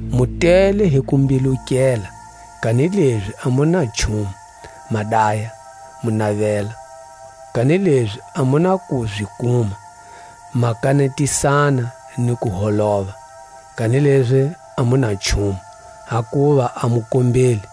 Mu tele hi kumbilukela, kanilezi a mu na nchumu; ma daya, mu navela, kanilezi a mu na ku zi kuma; ma kanetisana ni ku holova, kanilezi a mu na nchumu, hakuva a mu kombeli.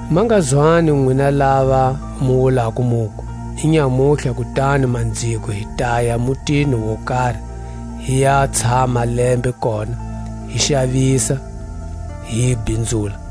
Ma nga zwani nwina lava mu wulako muku: Inyamutlha kutani manziko hi taya mutini wo kari, hi ya tshama lembe kona, hi xavisa, hi bhinzula;